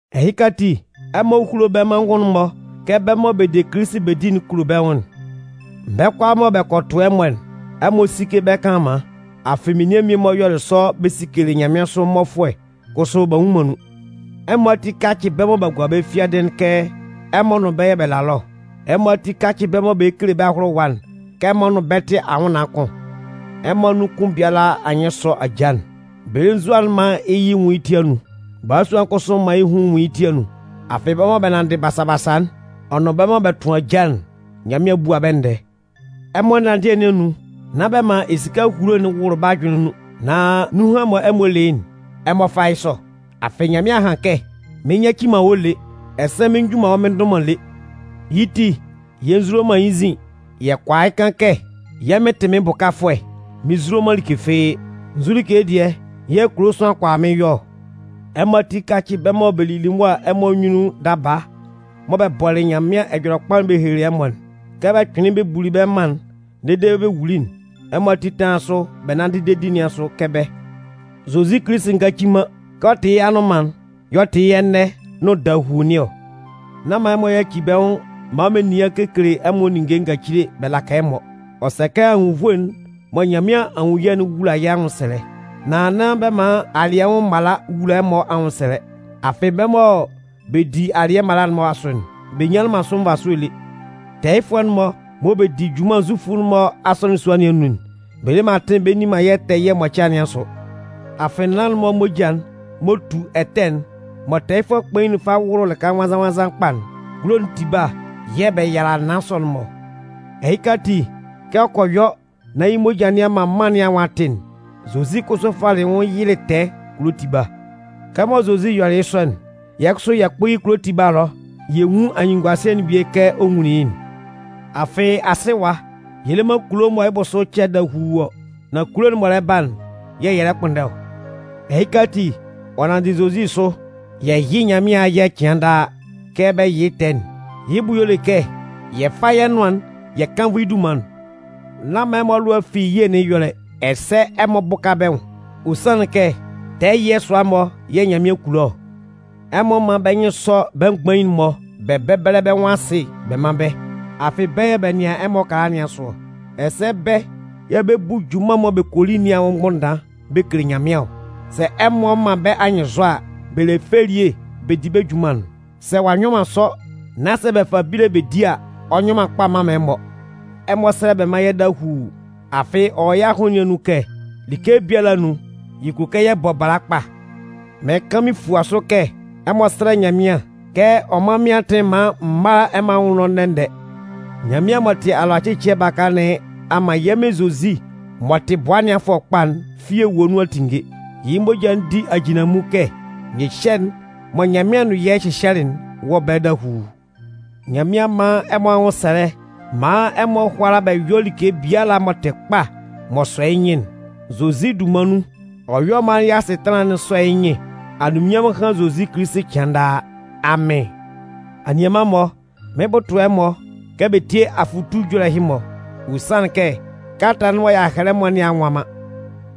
Ɛhɩka ati ɛmɔ húlo bɛ́ amanngun'n-mɔ kɛ bɛ́ mɔ bɛ de Kilisi bɛ di'n kulo bɛ́ nwʋn'n. Bɛ́ kʋalaa mɔ bɛ kɔ tʋ ɛmɔ'n, ɛmɔ síke bɛ́ kanlanman. Afɩ menian mmie-mɔ yɔlɩ sɔ bɛ sikelɩ nyanmɩansʋ mmɔfʋɛ kʋsʋ b'a nnwun man nun. Ɛmɔ ati kácɩ bɛ́ mɔ b'a gua bɛ́ fiadɩ'n kɛ ɛmɔ nʋn bɛ́ yɛ̂ bɛ la ɛlɔ ɔ. Ɛmɔ ati kácɩ bɛ mɔ bɛ lɛ kele bɛ́ ahʋlʋwa'n kɛ ɛmɔ nʋn bɛ́ bɛ tɩ anwʋnnaan kʋn. Ɛmɔ anun kʋn biala anyɩn sɔ́ ajaa'n. Belenzua'n mán yɩ́ yɩ nwún yɩ́ ti anun. Balasua'n kʋsʋ mán yɩ́ hun nwún yɩ́ ti anun. Afɩ, bɛ́ mɔ bɛ nanndɩ basa-basa'n, ɔ nʋn bɛ́ mɔ bɛ tʋn ajaa'n, Nyanmɩan 'bua bɛ́ ndɛɛ. Ɛmɔ ɛnanndɩɛ nɩn anun, nán bɛ man esika ehulo'n wʋlʋ bɛ́ ajʋnlɩn nun. Nan nunhan mɔ ɛmɔ le yɩ́'n, ɛmɔ fá yɩ́ sɔ. Afɩ Nyanmɩan a han kɛ: Mɩn nyaci man wɔ́ lé, ɛsɛ mɩn nju man wɔ́ mɩn ndʋ man lé. Yɩ́ ti, yɛ nzulo man yɩ́ nzin. Yɛ kʋala yɩ́ kan kɛ: Yɛ́ Mɩn tɩ mɩ́n bʋkafʋɛ, mɩn nzulo man like fɩ́ɩ́. Nzu like dɩɛ yɛ̂ kulo sʋanlan kʋala mɩ́n yɔ ɔ? Ɛmɔ ati kácɩ bɛ́ mɔ bɛ lili ɛmɔ anyunnun daba mɔ bɛ bɔlɩ Nyanmɩan Ɛjɔlɛkpa'n bɛ helelɩ ɛmɔ'n. Kɛ bɛ kpɩnlɩn bɛ buli bɛ́ mân'n dede bɛ wuli'n, ɛmɔ ati tánlan sʋ bɛ nánndɩ dedi nɩn asʋ kɛ bɛ́. Zozi Kilisi ngaci man. Kɛ ɔ tɩ yɩ́ anʋnman'n y'ɔ tɩ yɩ́ ɛnɛ nʋn dahuu nɩn ɔ. Nán man ɛmɔ yaci bɛ́ nwʋn maan menian kekele ɛmɔ ninnge ngacile bɛ laka ɛmɔ. Ɔ sɛ kɛ anwunnvoe'n mɔ Nyanmɩan a nwun yɛ́'n wúla yɛ́ anwʋnsɛlɛ. Nan nán bɛ man alɩɛ anwʋn mala wula ɛmɔ anwʋnsɛlɛ. Afɩ bɛ́ mɔ bɛ di alɩɛ mala'n-mɔ asʋ'n, bɛ nyanlɩn man sʋ nvasʋɛ lé. Tɛɛyɩfʋɛ'n-mɔ mɔ bɛ di junman Zufʋ'n-mɔ asɔnɩn sua nɩn anun'n, bɛ le man atɩn bɛ nni man yɛ́ tɛɛ ɛyɩɛ mʋcɩa nɩn asʋ. Afɩ naan'n-mɔ moja'n m'ɔ tu ɛtɛ'n mɔ tɛɛyɩfʋɛ kpain'n fa wʋlʋ lɩka nwannzan-nwannzan kpa'n, kulo'n tiba yɛ̂ bɛ yala naan sɔ'n-mɔ ɔ. Ɛhɩka ati, kɛ ɔ kɔ yɔ nán yɩ́ moja nɩn a man mân nɩn anwʋn a tɩ'n, Zozi kʋsʋ falɩ yɩ́ nwʋn yɩlɩ tɛɛ kulo tiba. Kɛmɔ Zozi yɔlɩ yɩ́ sɔ'n, yɛ́ kʋsʋ yɛ kpʋ́ yɩ́ kulo tiba ɛlɔ yɛ nwún anyunnunguasɩɛ'n bie kɛ ɔ nwunlin yɩ́'n. Afɩ, asɩ ɛwa, yɛ le man kulo mɔ yɩ́ bʋsʋ cɛ dahuu ɔ. Nan kulo'n m'ɔ lɛ ba'n yɛ̂ yɛ lɛ kpʋnndɛ ɔ. Ɛhɩka ati, ɔ nanndɩ Zozi asʋ, yɛ yɩ́ Nyanmɩan ayɛ cɩan daa kɛ bɛ yɩ tɛɛ'n. Yɩ́ bʋ y'ɔ le kɛ yɛ fá yɛ́ nʋan'n yɛ kánnvʋ yɩ́ dunman'n. Nán man ɛmɔ alʋa fi ye nɩn ɛyɔlɛ, ɛsɛ ɛmɔ bʋ́ka bɛ́ nwʋn. Ɔ sanlɩn kɛ tɛɛ ɛyɩɛ sʋa-mɔ yɛ̂ Nyanmɩan kulo ɔ. Ɛmɔ mán bɛ nyɩn sɔ́ bɛ́ mgbain'n-mɔ bɛ bɛ́bɛlɛ bɛ́ nwʋn asɩ bɛ mán bɛ́. Afɩ bɛ́ yɛ̂ bɛ nɩan ɛmɔ ɛkala nɩn asʋ ɔ. Ɛsɛ bɛ́ yɛ̂ bɛ 'bu junman'n mɔ bɛ kɔ li nɩn anwʋn mgbʋnndan bɛ kele Nyanmɩan ɔ. Sɛ ɛmɔ man bɛ́ anyɩnnzɔ a, bɛ le fɛ elie bɛ 'di bɛ́ junman'n. Sɛ ɔ'a nyɔ man sɔ nán bɛ fa bíle bɛ di a, ɔ nyɔ man kpa mman man ɛmɔ. Ɛmɔ sɛ́lɛ bɛ mán yɛ́ dahuu. Afɩ ɔ wɔ yɛ́ ahʋnlɩn nun kɛ like biala anun, yɛ kulo kɛ yɛ bɔ bala kpa. Mɩɩn kan mɩn fua sʋ kɛ ɛmɔ sɛ́lɛ Nyanmɩan kɛ ɔ mán mɩ́n atɩn maan m mála ɛmɔ anwʋn ɛlɔ ndɛ-ndɛ. Nyanmɩan m'ɔ tɩ alʋacɩcɩɛ baka nɩn a man yɛ́ Mɩn Zozi m'ɔ tɩ bʋa ɛnɩanfʋɛ kpa'n fi ewue nun a tinnge. Yɩ́ moja'n di ajinlanmun kɛ nyɩhyɛ'n mɔ Nyanmɩan nʋn yɛ́ hyɩhyɛlɩ'n wɔ ɛbɛlɛ dahuu. Nyanmɩan mán ɛmɔ anwʋnsɛlɛ maan ɛmɔ hʋ́ala bɛ yɔ́ like biala m'ɔ tɩ kpa m'ɔ sɔ yɩ́ nyɩn'n. Zozi dunman nun, ɔ yɔ́ maan yɛ́ asɩtanlan'n sɔ́ yɩ́ nyɩn. Anunminnyanmʋn hán Zozi Kilisi cɩan daa! Amɩn! Anianman-mɔ, mɩn 'bʋtʋ ɛmɔ kɛ bɛ sí abʋtalɛ bɛ tíe afʋtu ɛjɔlɛ ɛhɩ-mɔ. Ɔ sanlɩn kɛ kalata'n mɔ m'an hɛlɛ ɛmɔ nɩn a nwa man.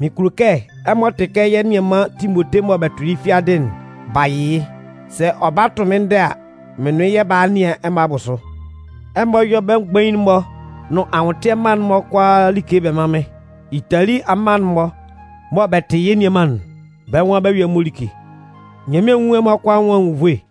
Mɩn kulo kɛ ɛmɔ tɩ kɛ yɛ́ nianman Timote mɔ bɛ tʋlɩ yɩ́ fiadɩ'n, b'a yɩ yɩ́. Sɛ ɔ ba tʋ mɩ́n ndɛ a, mɩ́n nʋn yɩ́ yɛ 'ba a a nɩan ɛmɔ abʋsʋ. Ɛmɔ yɔ́ bɛ́ mgbain'n-mɔ nʋn anwʋntɩɛ mma'n-mɔ kʋalaa like bɛ mán mɩ́n. Itali amma'n-mɔ mɔ bɛ tɩ yɛ́ nianman'n, bɛ́ nwan bɛ 'yɔ ɛmɔ like. Nyanmɩan nwún ɛmɔ kʋalaa anwʋn anwunnvoe.